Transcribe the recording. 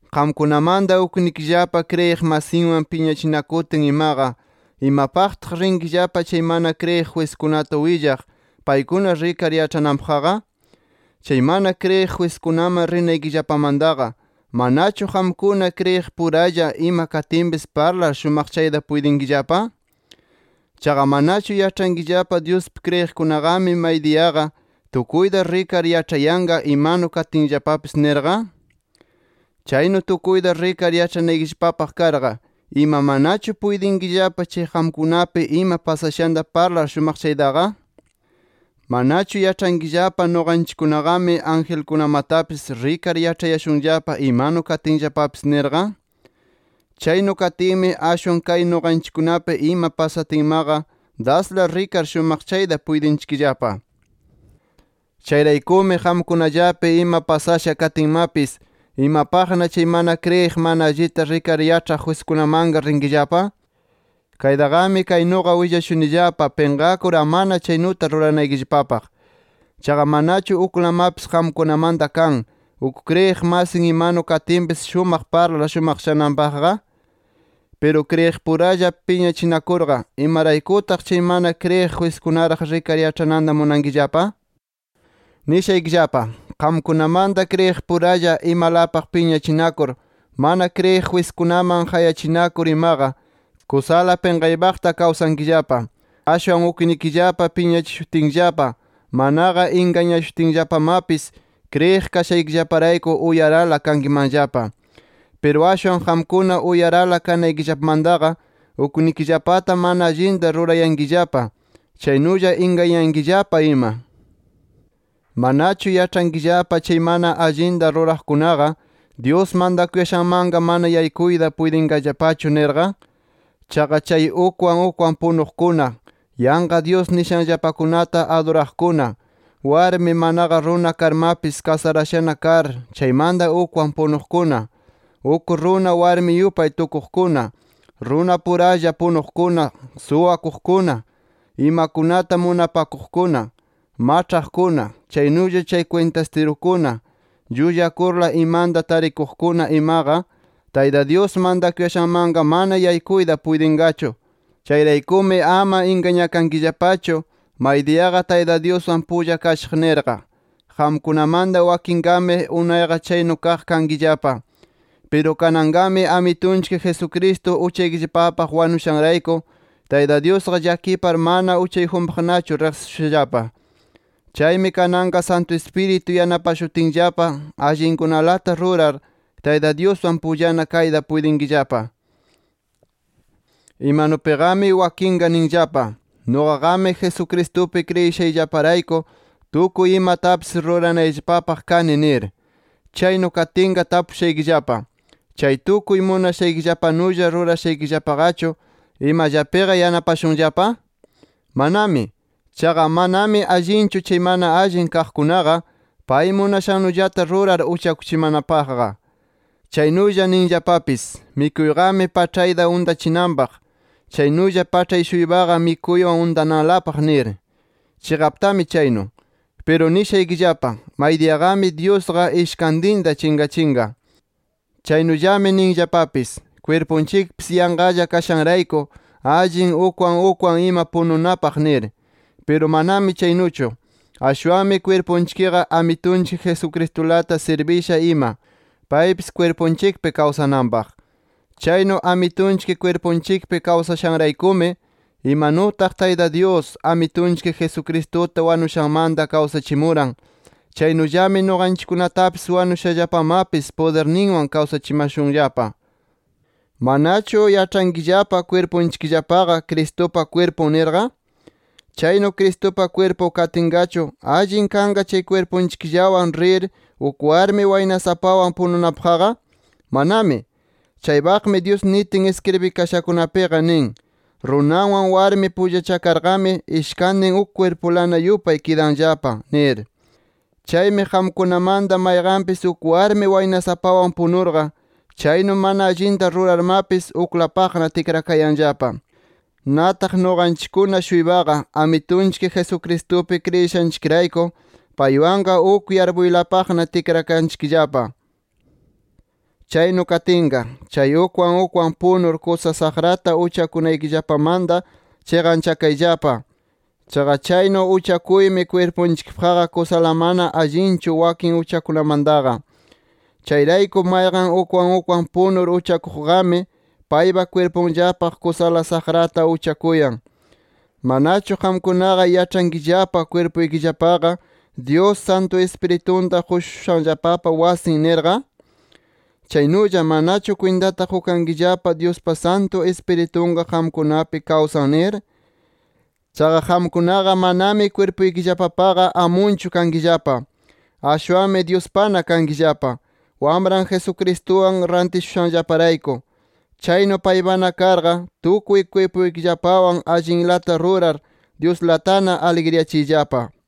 Qamkunamanta, uknikillapa kriyiq masinwan piñachinakutin imaqa, ¿imapaqtaq rinkillapa chay mana kriyiq jwiskunata willaq, paykuna rikar yaĉhananpaqqa? Chay mana kriyiq jwiskunaman rinaykillapamantaqa, ¿manachu qamkuna kriyiqpuralla, ima katinpis parlar shumaqchayta puytinkillapa? ¿Chaqa manachu yaĉhankillapa Dyuspi kriyiqkunaqami maydiyaqa, tukuyta rikar yaĉhayanqa imanu katinllapapis nirqa? Chaynu tukuyta rikar yaĉhanaykillapapaq karqa, ¿ima manachu puytinkillapa, chay qamkunapi ima pasashanta parlar shumaqchaytaqa? ¿Manachu yaĉhankillapa nuqanchikkunaqami angelkunamatapis rikar yaĉhayashunllapa imanu katinllapapis nirqa? ¡Chaynu katinmi, ashwan kay nuqanchikkunapi ima pasatinmaqa dasla rikar shumaqchayta puytinchikllapa! Chayraykumi qamkunallapi ima pasasha katinmapis, ¿imapaqna chay mana kriyiq, mana allita rikar yaĉhaq jwiskunamanqa rinkillapa? Kaytaqami kaynuqa willashunillapa pinqakur amana chaynuta ruranaykillapapaq. ¿Chaqa manachu uklamapis qamkunamanta kan, uk kriyiq masin imanu katinpis shumaq parlar shumaqchananpaqqa? Piru kriyiqpuralla piñachinakurqa, ¿imaraykutaq chay mana kriyiq jwiskunaraq rikar yaĉhananta munankillapa? ¡Nishaykillapa! qamkunamanta kriyiqpuralla imalapaq piñachinakur mana kriyiq jwiskunaman qayachinakur imaqa, kusala pinqaypaqta kawsankillapa. Ashwan uknikillapa piñachishutinllapa, manaqa ingañashutinllapamapis, kriyiq kashaykillaparayku, uyarala kankimanllapa. Piru ashwan qamkuna uyarala kanaykillapamantaqa, uknikillapata mana allinta rurayankillapa, chaynulla ingañayankillapa ima. ¿Manachu yaĉhankillapa chay mana allinta ruraqkunaqa, Dyus mantakuyashanmanqa mana yaykuyta puytinqallapachu nirqa? Chaqa chay ukwan ukwan punuqkuna, yanqa dyus nishanllapakunata aduraqkuna, warmi, manaqa runa karmapis kasarashana kar, chaymanta ukwan punuqkuna, uk runa warmi yupay tukuqkuna, runapuralla punuqkuna, suwakuqkuna, imakunata munapakuqkuna, maĉhaqkuna, chaynulla chay kwintastirukuna, llullakurla imanta tarikuqkuna imaqa, Tayta Dyus mantakuyashanmanqa mana yaykuyta puytinqachu. Chayraykumi ama ingañakankillapachu maydiyaqa Tayta Dyuswan pulla kashaq nirqa. Qamkunamanta wakinqami, unayqa chaynu kaq kankillapa. Piru kananqami, Amitunchik Jesucristo uchaykillapapaq wanushanrayku Tayta Dyusqa llakipar, mana uchayjunpaqnachu riqsishushallapa. Chaymi kananqa Santu Ispiritu yanapashutinllapa allinkunalata rurar, Tayta Dyuswan pullana kayta puytinkillapa. Imanupiqami wakinqa ninllapa: Nuqaqami Jesucristupi kriyishayllaparayku tukuy imatapis ruranayllapapaq kani nir. Chaynu katinqa tapushaykillapa: ¿Chay tukuy munashaykillapanulla rurashaykillapaqachu imallapiqa yanapashunllapa? ¡Manami! Chaqa manami allinchu chay mana allin kaqkunaqa, pay munashannullata rurar uchakuchimanapaqqa. Chaynulla ninllapapis: Mikuyqami paĉhayta untachinanpaq. Chaynulla paĉhay-shuypaqa mikuywan untananlapaq nir. ¡Chiqaptami chaynu! Piru nishaykillapa maydiyaqami Dyusqa ishkantinta chinqachinqa. Chaynullami ninllapapis, kwirpunchikpis yanqalla kashanrayku, allin ukwan ukwan ima pununapaq nir. Piru manami chaynuchu, ashwanmi kwirpunchikqa Amitunchik Jesucristulata sirbisha ima, paypis kwirpunchikpi kawsananpaq. Chaynu Amitunchik kwirpunchikpi kawsashanraykumi, imanutaq Tayta Dyus, Amitunchik Jesucristuta wanushanmanta kawsachimuran, chaynullami nuqanchikkunatapis wanushallapamapis pudirninwan kawsachimashunllapa. ¿Manachu yaĉhankillapa kwirpunchikllapaqa Cristupa kwirpun nirqa? ¿Chaynu Cristupa kwirpun katinqachu, allin kanqa chay kwirpunchikllawan rir uk warmi waynasapawan pununapaqqa? ¡Manami! Chaypaqmi Dyus nitin iskribikashakunapiqa nin: “Runawan warmi pullachakarqami, ishkantinqa uk kwirpulana yupay kidanllapa” nir. Chaymi qamkunamanta mayqanpis uk warmi waynasapawan punurqa, chaynu mana allinta rurarmapis, uklapaqna tikrakayanllapa. Nataq nuqanchikkuna-shuypaqa, Amitunchik Jesucristupi kriyishanchikrayku, paywanqa uk yarpuylapaqna tikrakanchikllapa. Chaynu katinqa, chay ukwan ukwan punur kusa saqrata uchakunaykillapamanta chiqanchakayllapa. Chaqa chaynu uchakuymi kwirpunchikpaqqa kusala mana allinchu, wakin uchakunamantaqa. Chayrayku mayqan ukwan ukwan punur uchakuqqami, paypa kwirpunllapaq kusala saqrata uchakuyan. ¿Manachu qamkunaqa yaĉhankillapa kwirpuykillapaqa, Dyus Santu Ispiritunta qushushanllapapa wasin nirqa? ¿Chaynulla manachu kwintata qukankillapa Dyuspa Santu Ispiritunqa qamkunapi kawsan nir? Chaqa qamkunaqa, manami kwirpuykillapapaqa amunchu kankillapa. Ashwanmi Dyuspana kankillapa, Wamran Jesucristuwan rantishushanllaparayku. Chaynu paypana karqa, tukuy kwirpuykillapawan allinlata rurar Dyuslatana aligriyachiyllapa.